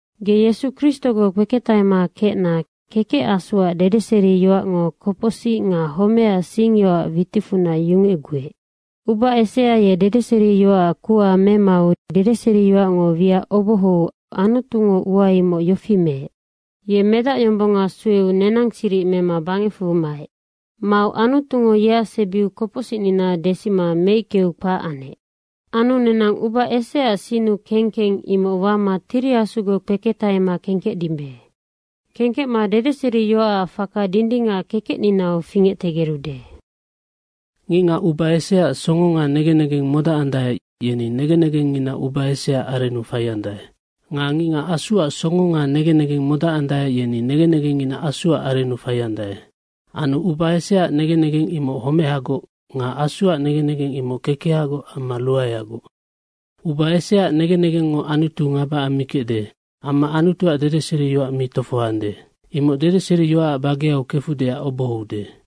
Ge Yesu Kristogoc kpeketahema kecna Kekec Asuac dedeseriyoacngo kopocsic nga homecac singyoacac witicfunac yungecguec. Uba esea ye dedeseriyoacac kuha memau dedeseriyoacngo wiac obohou Anutungo ua imoc yofi meec. Ye Medacyombonga sueu nenang siric mema bangecfu maec. Mau Anutungo yeac sebiu kopocsicnina desima meickeu kpac anec. Anu nenang uba eseaac sinnu kengkeng imoc wama Tiri Asugoc kpeketahema kengkecdimbe. Kengkecma dedeseriyoacac faka dindingac kekecninau fingectegerude. Ngicngac uba eseaac songo nga negen negeng modacandae, yeni negen negengngina uba eseaac arennu faiandae. Nga ngicngac Asuac songo nga negen negeng modacandae, yeni negen negengngina Asuac arennu faiandae. Anu uba eseaac negen negeng imoc homehagoc nga Asuac negen negeng imoc kekehagoc amma ruaeagoc. Uba eseaac negen negengngo Anutu ngaba ammikecde amma Anutuac dedeseriyoac mi tofohoande. Imoc dedeseriyoacac bageau kefudeac obohoude.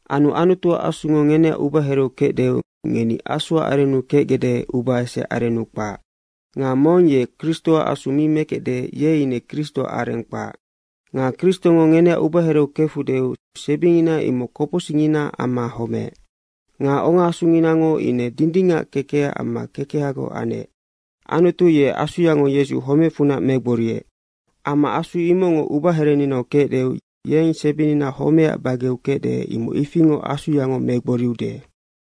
Anu Anutuac Asungo ngeneac ubahereu kecdeu ngeni Asuac arennu kecgecde, uba eseaac arennu kpac. Nga mong ye Kristoac Asu mi mekecde, ye ine Kristoac areng kpac. Nga Kristongo ngeneac ubahereu kefudeu sebingina imoc kopocsicnginaac amma homeec. Nga ongaasunginango ine dindingac kekecac amma kekehagoc anec. Anutu ye Asuyango Yesu homecfunac megboriec. Amma Asu imocngo ubaherenginau kecdeu yeng sebingina homecac bageau kecde, imoc ifingoc Asuyango megboriude.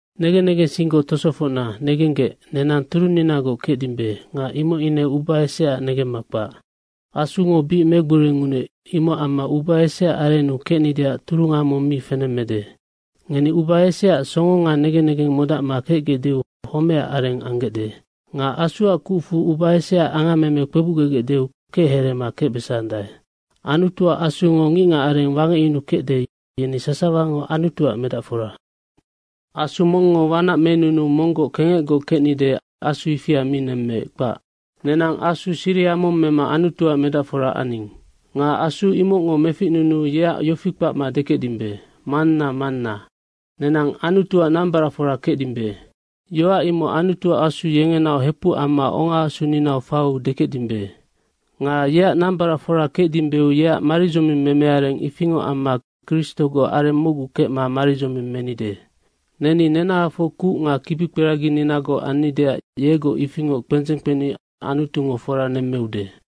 Negen negensinggoc tosofocna, negenggec, nenang turunninagoc kecdimbe nga imoc ine uba eseaac negemma kpac. Asungo bic megborinunuec, imocac amma uba eseaac arennu kecnideac turunga mong mi fenemmede. Ngeni uba eseaac songo nga negen negeng modacma kecgecdeu homeac areng anggecde. Nga Asuac kucfu uba eseaac angammeme kpebucgegecdeu kechereema kecbesandae. Anutuac Asungo ngicngacareng wangecyunukecde, yeni sasawango Anutuac medacfora. Asu mongngo wanac menunuu monggoc kengecgoc kecnide, asu ifia mi nemmec, kpac. Nenang asu siriha mong mema Anutuac medacfora aning. Nga Asu imocngo meficnunuu yeac yofi kpacma dekecdimbe, “Manna, Manna.” Nenang Anutuac nambaracfora kecdimbe, yoac imocnoc Anutuac Asu yengenaoc hepuc amma ongaasuninau faiu dekecdimbe. Nga yeac nambaracfora kecdimbeu yeac maridzoming memeareng ifingoc amma Kristogoc areng mocgu kecma maridzoming menide. Neni nenahafoc kuc nga kibikperagininagoc annideac yegoc ifingoc kpendzeng kpeni Anutungo fora nemmeude.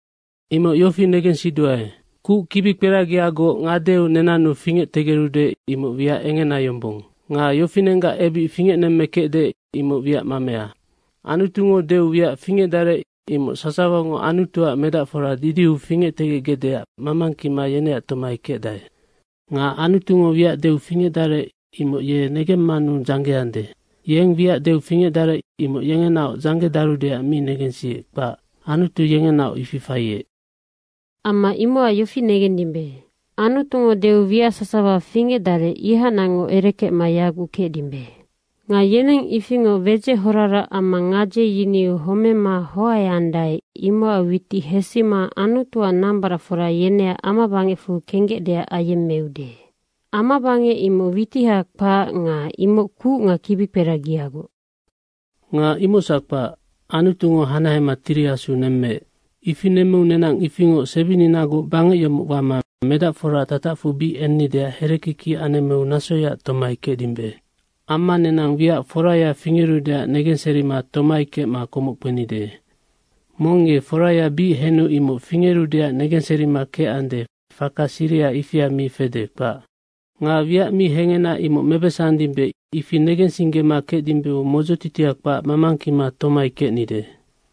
Imoc yofi negensiduae, kuc kibikperagiagoc ngadeu nenannu fingectegerude, imoc wiac engena yombong nga yofinenggac ebic fingecnemmekecde, imoc wiac mamea. Anutungo deu wiac fingecdarec imoc sasawango Anutuac medacfora didiu fingectegecgecdeac mamangkima yeneac tomai kecdae. Nga Anutungo wiac deu fingecdarec, imoc ye negemmanu dzanggeande. Yeng wiac deu fingecdarec, imoc yengenaoc dzanggedarudeac mi negensiec, kpac. Anutu yengenaoc ifi faiec. Amma imocac yofi negendimbe, Anutungo deu wiac sasawa fingecdarec, ihacnacngoc erekecma yaguc kecdimbe. Nga yeneng ifingoc wedzec horarac amma gadze yiniu homema hoaeandae, imocac witic hesima Anutuac nambaracfora yeneac amabangecfu kenggecdeac ayemmeude. Amabangec imoc witiha kpac nga imoc kuc nga kibikperagiagoc. Nga imocsac kpac. Anutungo hanahema Tiri Asu nemmeec. Ifi nemmeu nenang ifingoc sebininagoc bangec yomoc wama medacforaac tatacfu bic ennideac herekiki anemmeu nasoyaac tomai kecdimbe. Amma nenang wiac foraya fingerudeac negenserima tomai kecma komoc kpenide. Mong ye foraya bic henu imoc fingerudeac negenserima kecande, faka siriha ifia mi fede, kpac. Nga wiac mi hengena imoc mebesandimbe, ifi negensinggema kecdimbeu modzotitia kpac mamangkima tomai kecnide.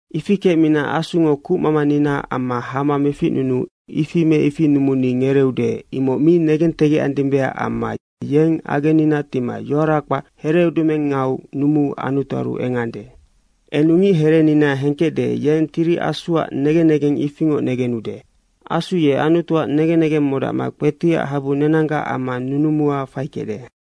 Ifi kecmina Asungo kucmamaninaac amma hama meficnunuu ifi me ifi numuni ngereeude, imoc mi negentegecandimbeac amma yeng agennina tima yoara kpac hereudumengau numuu Anutuaru engande. Enu ngicherenina hengkecde, yeng Tiri Asuac negen negeng ifingoc negenude. Asu ye Anutuac negen negeng modacma kpetiac habu nenanggac amma nunumua faikecde.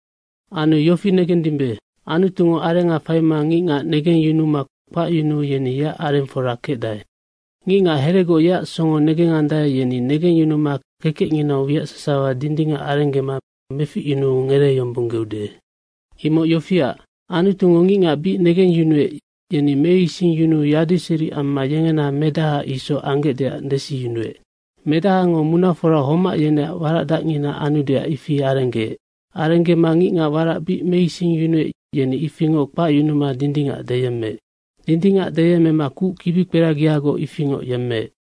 Anu yofi negendimbe, Anutungo arenga faima ngicngac negengyunuma kpacyunuu yeni yeac arengfora kecdae. Ngicngac heregoc yeac songo negengandae, yeni negengyunuma kekecnginau wiac sasawa dindingac arenggema meficyunuu ngereeyombonggeude. Imoc yofiac, Anutungo ngicngac bic negengyunuec, yeni meisingyunuu yadiseri amma yengena Medaha isoc anggecdeac desiyunuec. Medahango munafora homac yeneac waracdacngina anudeac ifi arenggeec. Arenggema ngicngac warac bic meisingyunuec, yeni ifingoc kpacyunuma dindingac deyemmeec. Dindingac deyemmema kuc kibikperagiagoc ifingoc yemmeec.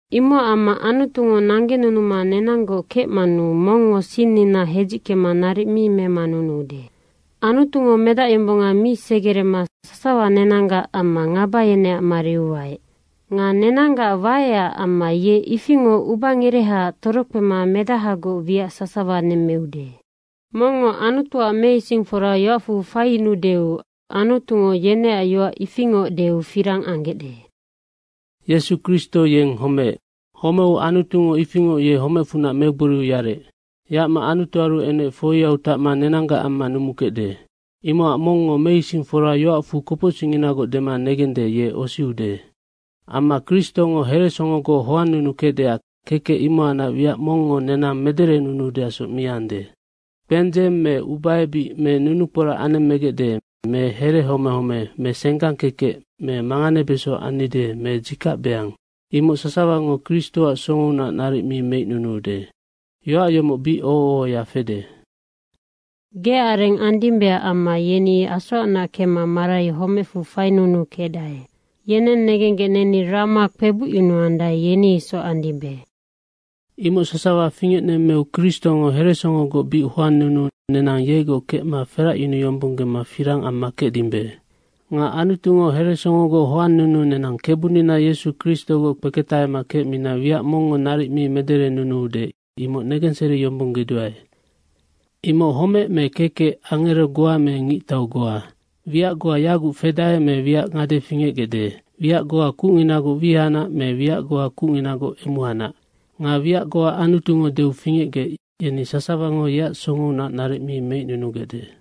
Imocac amma Anutungo nanggenunuma nenanggoc kecmanu mongngo sinnina hedzickema naric mi memanunuude. Anutungo Medacyombonga mi segerema sasawa nenanggac amma ngaba yeneac mariu waec. Nga nenanggac waecac amma ye ifingoc ubangerehaac torokpema Medahagoc wiac sasawa nemmeude. Mongngo Anutuac meisingfora yoacfu faiyunuudeu, Anutungo yeneac yoac ifingoc deu firang anggecde. Yesu Kristo yennoc homeec. Homeu Anutungo ifingoc ye homecfunac megboriu yarec. Yacma Anutuaru enec, foiau tacma nenanggac amma numukecde. Imocac mongngo meisingfora yoacfu kopocsicninagoc dema negende, ye osiude. Amma Kristongo heresongogoc hoannunukecdeac, kekec imohacnac wiac mongngo nenang mederenunuudeacsoc mi ande. Kpendzeng me ubaebic me nunukporac anemmegecde me herehomehome me senggang kekec me manganebeso annide me dzikacbeang, imoc sasawango Kristoac songounac naric mi meicnunuude. Yoac yomoc bic oho ohoya fede, “Geac areng andimbeac amma yeni asoacnac kemma marai homecfu fainunukecdae. Yeneng nenenggec neni rama kpebucyunuandae, yeni isoc andimbe.” Imoc sasawa fingecnemmeu Kristongo heresongogoc bic hoannunuu nenang yegoc kecma feracyunuyombonggema firang amma kecdimbe. Nga Anutungo heresongogoc hoannunuu nenang Kebunina Yesu Kristogoc kpeketahema kecmina wiac mongngo naric mi mederenunuude, imoc negenseriyombonggeduae. Imoc homec me kekec, angero goa me ngictau goa, wiac goa yaguc fedae me wiac ngade fingecgecde, wiac goa kucnginagoc wihacnac me wiac goa kucnginagoc emuhacnac nga wiac goa Anutungo deu fingecgec, yeni sasawango yeac songounac naric mi meicnunugecde.